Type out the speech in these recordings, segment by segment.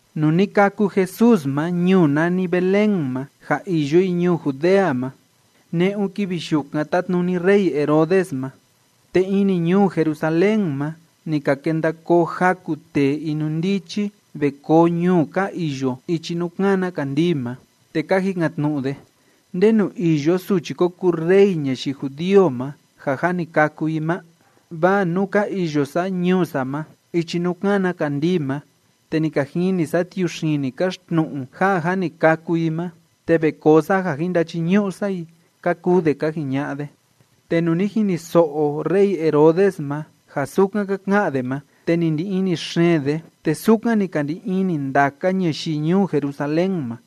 Nuu ni kâku Jesús ma ñuu nani Belén ma ja iyo i ñuu Judea ma, ne'un kivi yukan tátnuni rey Herodes ma. Te ini ñuu Jerusalén ma, ni ka kenda koo jaku tee inundichi ve koo ñuu ka iyo ichi nuu kána kandii ma. Te ka jikan‑tnu'u de: ―¿Ndenu iyo suchi ko kuu rey ñayii judío ma ja jâ ni kâku i ma? Vaa nuu ka iyo sa ñuu sa ma ichi nuu kána kandii ma, te ni ka jini sa tiuxini káxtnu'u ja jâ ni kâku i ma, te ve koo sa ja jin ndachiñu'u sa i ―ka kuu de ka jiña'a de. Te nuu ni jiniso'o rey Herodes ma ja sukan ka ka'an de ma, te ni ndi ini xeen de, te sukan ni ka ndi ini ndaka ñayii ñuu Jerusalén ma.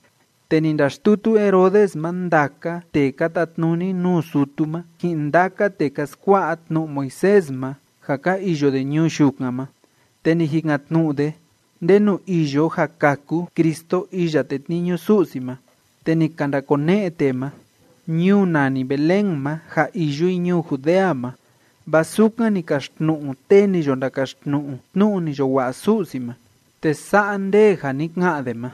Te ni ndaxtutu Herodes ma ndaka tee ka tatnuni nuu sutu ma, ji'in ndaka tee ka skua'a tnu'u Moisés ma ja ka iyo de ñuu yukan ma, te ni jikan‑tnu'u de ndenu iyo ja kâku Cristo iya tetniñu Su'si ma. Te ni ka ndakone'e tee ma: ―Ñuu nani Belén ma ja iyo i ñuu Judea ma, vaa sukan ni kaxtnu'u tee ni yo ndakaxtnu'u tnu'u ni yo wa'a Su'si ma, te sa'a nde a ni ka'an de ma: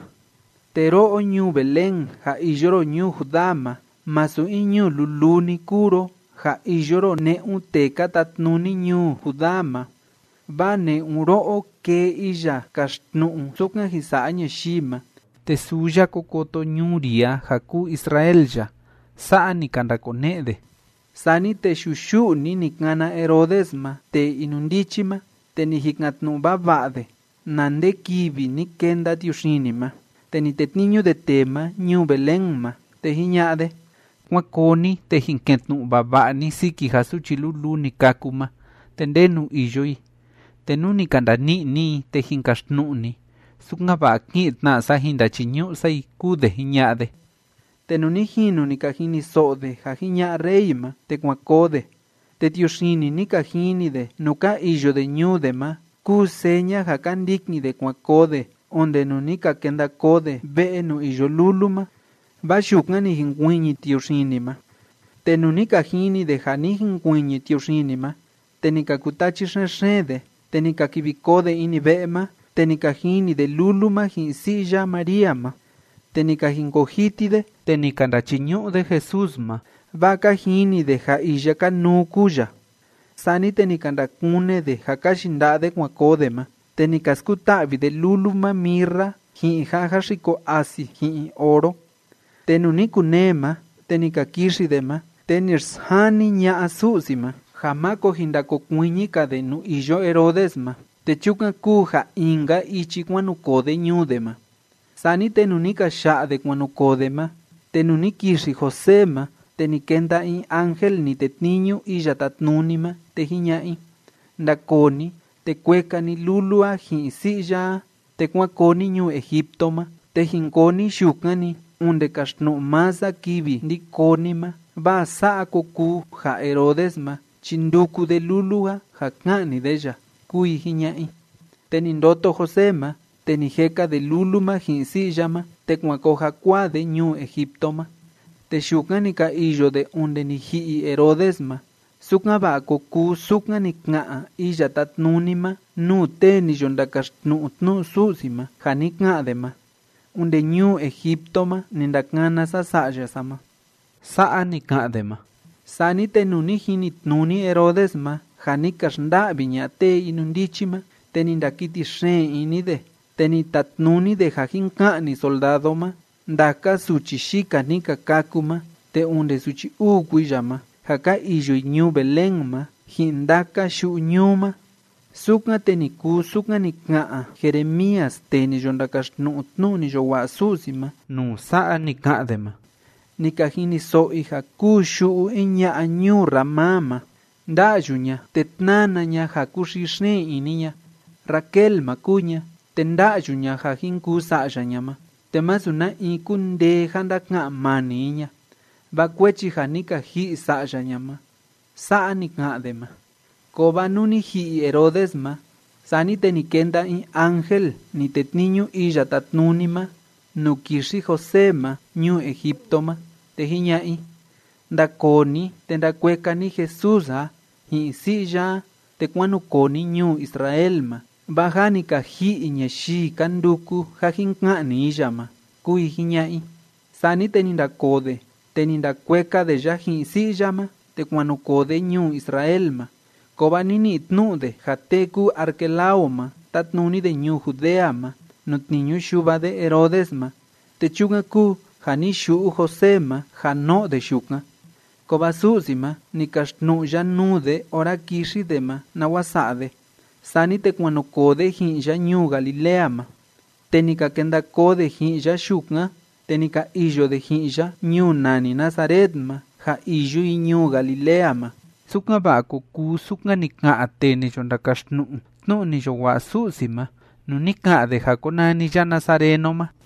Te ro'o ñuu Belén ja iyo ro ñuu Judá ma, masu in ñuu luluu‑ni kúu ro ja iyo ro ne'un tee ka tatnuni ñuu Judá ma, vaa ne'un ro'o kee iya kaxtnu'u sukan jin sa'a ñayii ma, te suu ya ko koto ñuu ri a ja kuu Israel ya. ―Sa'a ni ka ndakone'e de. Sani te yuyu'u‑ni ni kana Herodes ma tee inundichi ma, te ni jikan‑tnu'u vava'a de na nde kivi ni kenda tiuxini ma. Te ni tetniñu de tee ma ñuu Belén ma, te jiña'a de: ―Kuán koo ni, te jin ke'en tnu'u vava'a ni siki ja suchi luluu ni kâku ma te ndenu iyo i, te nú ni ka ndani'i ni i, te jin kaxtnu'u ni, sukan‑va'a ki'in tna sa jin ndachiñu'u sa i ―kúu de jiña'a de. Te nuu ni jinu ni ka jiniso'o de ja jiña'a rey ma, te kuan koo de, te tiuxini ni ka jini de nuu ka iyo de ñuu de ma kúu seña ja ka ndikin de kuan koo de onde nuu ni ka kenda koo de ve'e nuu iyo lulu ma, vaa yukan ni jinkuiñi tiuxini ma. Te nuu ni ka jini de ja ni jinkuiñi tiuxini ma, te ni ka kutachi xen‑xeen de. Te ni ka kivi koo de ini ve'e ma, te ni ka jini de lulu ma ji'in si'i ya María ma, te ni ka jinkoo jiti de, te ni ka ndachiñu'u de Jesús ma, vaa ka jini de ja iya kanuu kúu ya. Sani te ni ka ndakune de ja ka yinda'a de kuan koo de ma, te ni ka skuta'vi de lulu ma mirra ji'in ja jáxiko asi ji'in oro. Te nuu ni kunee ma te ni ka kixi de ma, te ni xsjani ña'a Su'si ma ja máko jin ndakokuiñi‑ka de nuu iyo Herodes ma, te chukan kúu ja in‑ka ichi kuan nu koo de ñuu de ma. Sani te nuu ni ka ya'a de kuan nu koo de ma, te nuu ni kixi José ma, te ni kenda in ángel ni tetniñu Iya Tátnuni ma, te jiña'a i: ―Ndakoo ni, te kueka ni lulu a ji'in si'i ya a, te kuán koo ni ñuu Egipto ma, te jin koo ni yukan‑ni onde kaxtnu'u maa sa kivi ndi koo ni ma, vaa sa'a ko kuu ja Herodes ma chi nduku de lulu a ja ka'ni de ya ―kúu i jiña'a i. Te ni ndoto José ma, te ni jeka de lulu ma ji'in si'i ya ma, te kuan koo jakuaa de ñuu Egipto ma. Te yukan ni ka iyo de onde ni ji'i Herodes ma, sukan‑va'a ko kuu sukan ni ka'an Iya Tátnuni ma nuu tee ni yo ndakaxtnu'u tnu'u Su'si ma ja ni ka'an de ma: “Onde ñuu Egipto ma ni ndakana sa Sa'ya sa ma.” Sa'a ni ka'an de ma. Sani te nuu ni jinitnuni Herodes ma ja ni ka xnda'vi ña'a tee inundichi ma, te ni ndakiti xeen ini de, te ni tatnuni de ja jin ka'ni soldado ma ndaka suchi yika ni ka kâku ma te onde suchi uu kuiya ma, ja ka iyo i ñuu Belén ma ji'in ndaka yu'u ñuu ma. Sukan, te ni kuu sukan ni ka'an Jeremías tee ni yo ndakaxtnu'u tnu'u ni yo wa'a Su'si ma nuu sa'a ni ka'an de ma: Ni ka jiniso'o i ja kúu yu'u in ña'a ñuu Ramá ma, nda'yu ña te tnána ña ja kúxii xeen ini ña. Raquel ma kúu ña, te nda'yu ña ja jin kuu sa'ya ña ma, te masu na in kúndee ja ndaka'an mani i ña, vaa kuechi ja ni ka ji'i sa'ya ña ma. Sa'a ni ka'an de ma. Kovaa nuu ni ji'i Herodes ma, sani te ni kenda in ángel ni tetniñu Iya Tátnuni ma nuu kixi José ma ñuu Egipto ma, te jiña'a i: ―Ndakoo ni, te ndakueka ni Jesús a ji'in si'i ya a, te kuán nu koo ni ñuu Israel ma, vaa jâ ni ka ji'i ñayii ka nduku ja jin ka'ni i ya ma ―kúu i jiña'a i. Sani te ni ndakoo de, te ni ndakueka de ya ji'in si'i ya ma, te kuan nu koo de ñuu Israel ma. Kovaa ni ni'i tnu'u de ja tee kúu Arquelao ma, tátnuni de ñuu Judea ma nuu tniñu yuva de Herodes ma, te chukan kúu ja ni yu'u José ma ja no'o de yukan. Kovaa Su'si ma, ni kaxtnu'u ya nuu de ora kixi de ma nawa sa'a de. Sani te kuan nu koo de ji'in ya ñuu Galilea ma. Te ni ka kenda koo de ji'in ya yukan, te ni ka iyo de ji'in ya ñuu nani Nazaret ma ja iyo i ñuu Galilea ma, sukan‑va'a ko kuu sukan ni ka'an tee ni yo ndakaxtnu'u tnu'u ni yo wa'a Su'si ma nuu ni ka'an de ja konani ya nazareno ma.